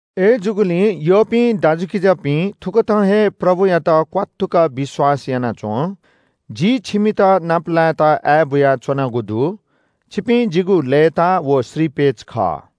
अय्‌जूगुलिं यःपिं दाजुकिजापिं, थुकथं हे प्रभुयात क्‍वात्तुक विश्‍वास याना च्‍वँ। जि छिमित नापलायेत आय्‌बुयाच्‍वनागु दु। छिपिं जिगु लय्‌ताः व श्रीपेच खः।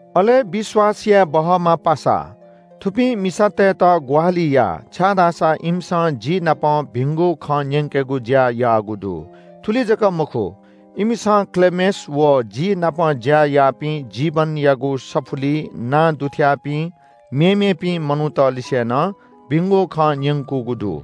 अले विश्‍वास याये बहःम्‍ह पासा, थुपिं मिसातय्‌त ग्‍वाहालि या। छाय्‌धाःसा इमिसं जि नाप भिंगु खँ न्‍यंकेगु ज्‍या याःगु दु। थुलि जक मखु, इमिसं क्‍लेमेस व जि नाप ज्‍या याःपिं जीवनयागु सफुलिइ नां दुथ्‍याःपिं मेमेपिं मनूतलिसे नं भिंगु खँ न्‍यंकूगु दु।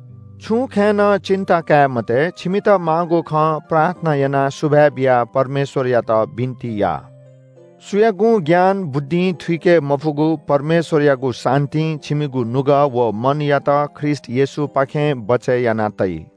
छुं खँय् नं पीर काये मते। छिमित माःगु खँ प्रार्थना यानाः सुभाय् बियाः परमेश्‍वरयात बिन्‍ति या। सुयागुं ज्ञान बुद्धिं थुइके मफुगु परमेश्‍वरयागु शान्‍तिं छिमिगु नुगः व मनयात ख्रीष्‍ट येशूपाखें बचय् याना तइ।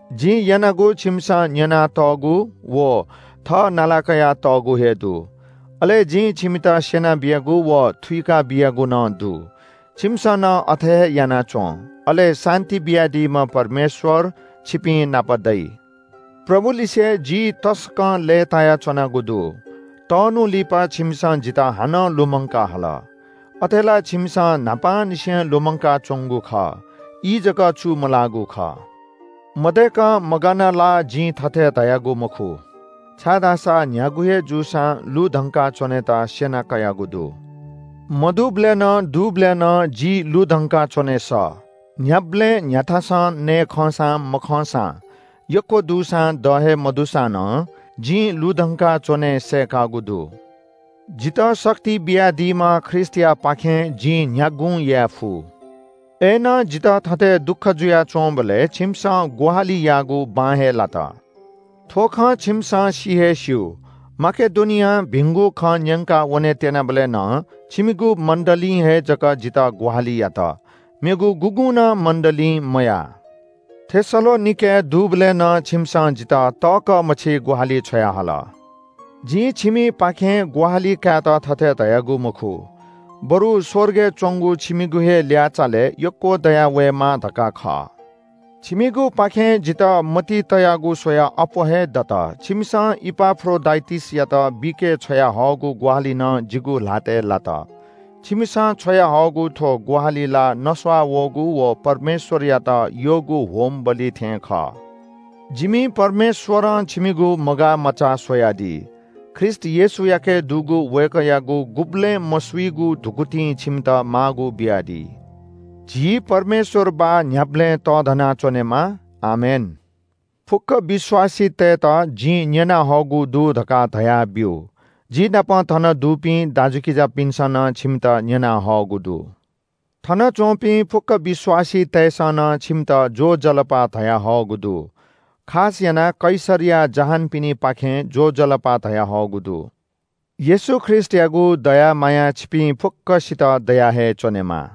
जिं यानागु छिमिसं न्‍यनातःगु व थः नालाकया तःगु हे दु। अले जिं छिमित स्‍यना बियागु व थुइका बियागु नं दु। छिमिसं नं अथे हे याना च्‍वँ। अले शान्‍ति बियादीम्‍ह परमेश्‍वर छिपिंनाप दइ। प्रभुलिसे जि तसकं लय्‌तायाच्‍वनागु दु। तःन्‍हु लिपा छिमिसं जितः हानं लुमंकाः हल। अथे ला छिमिसं न्‍हापांनिसें लुमंकाच्‍वंगु खः। ई जक चू मलाःगु खः। मदय्‌कं मगानाः ला जिं थथे धयागु मखु, छाय्‌धाःसा न्‍ह्यागु हे जूसां लुधंका च्‍वनेत स्‍यना कयागु दु। मदुबलय् नं दुबलय् नं जि लुधंकाच्‍वने सः। न्‍ह्याबलें न्‍ह्याथासं नये खंसां मखंसां, यक्‍व दुसां द हे मदुसा नं जिं लुधंकाच्‍वने सय्‌कागु दु। जितः शक्ति बियादीम्‍ह ख्रीष्‍टयापाखें जिं न्‍ह्यागुं याये फु। अय्‌नं जितः थथे दुःख जुयाच्‍वंबलय् छिमिसं ग्‍वाहालि याःगु बां हे लात। थ्‍व खँ छिमिसं सि हे स्‍यू माकेडोनियां भिंगु खँ न्‍यंकाः वने त्‍यनाबलय् नं छिमिगु मण्‍डलीं हे जक जितः ग्‍वाहालि यात, मेगु गुगुं नं मण्‍डलीं मयाः। थेसलोनिकेय् दुबलय् नं छिमिसं जितः तःकः मछि ग्‍वाहालि छ्वयाहल। जिं छिमिपाखें ग्‍वाहालि कायेत थथे धयागु मखु। बरु स्‍वर्गय् च्‍वंगु छिमिगु हे ल्‍याःचालय् यक्‍व दयावयेमा धकाः खः। छिमिगुपाखें जितः मतिइ तयागु स्‍वयाः अप्‍वः हे दत। छिमिसं इपाफ्रोडिटसयात बीके छ्वयाहःगु ग्‍वाहालि नं जिगु ल्‍हातय् लात। छिमिसं छ्वयाहःगु थ्‍व ग्‍वाहालि ला नस्‍वाः वःगु व परमेश्‍वरयात यःगु बलिदान थें खः। जिमि परमेश्‍वरं छिमिगु मगाःमचाः स्‍वयादी। ख्रीष्‍ट येशूयाके दुगु वय्‌कःयागु गुबलें मसुइगु धुकुतिं छिमित माःगु बियादी। झी परमेश्‍वर बाः न्‍ह्याबलें तःधना च्‍वनेमा। आमेन। फुक्‍क विश्‍वासीतय्‌त जिं न्‍यनाहःगु दु धकाः धयाब्‍यु। जि नाप थन दुपिं दाजुकिजापिन्‍सं नं छिमित न्‍यनाहःगु दु। थनच्‍वंपिं फुक्‍क विश्‍वासीतय्‌सं नं छिमित ज्‍वजलपा धयाहःगु दु। खास यानाः कैसरया जहानपिनिपाखें ज्‍वजलपा धयाहःगु दु। येशू ख्रीष्‍टयागु दया माया छिपिं फुक्‍कसित दया हे च्‍वनेमा।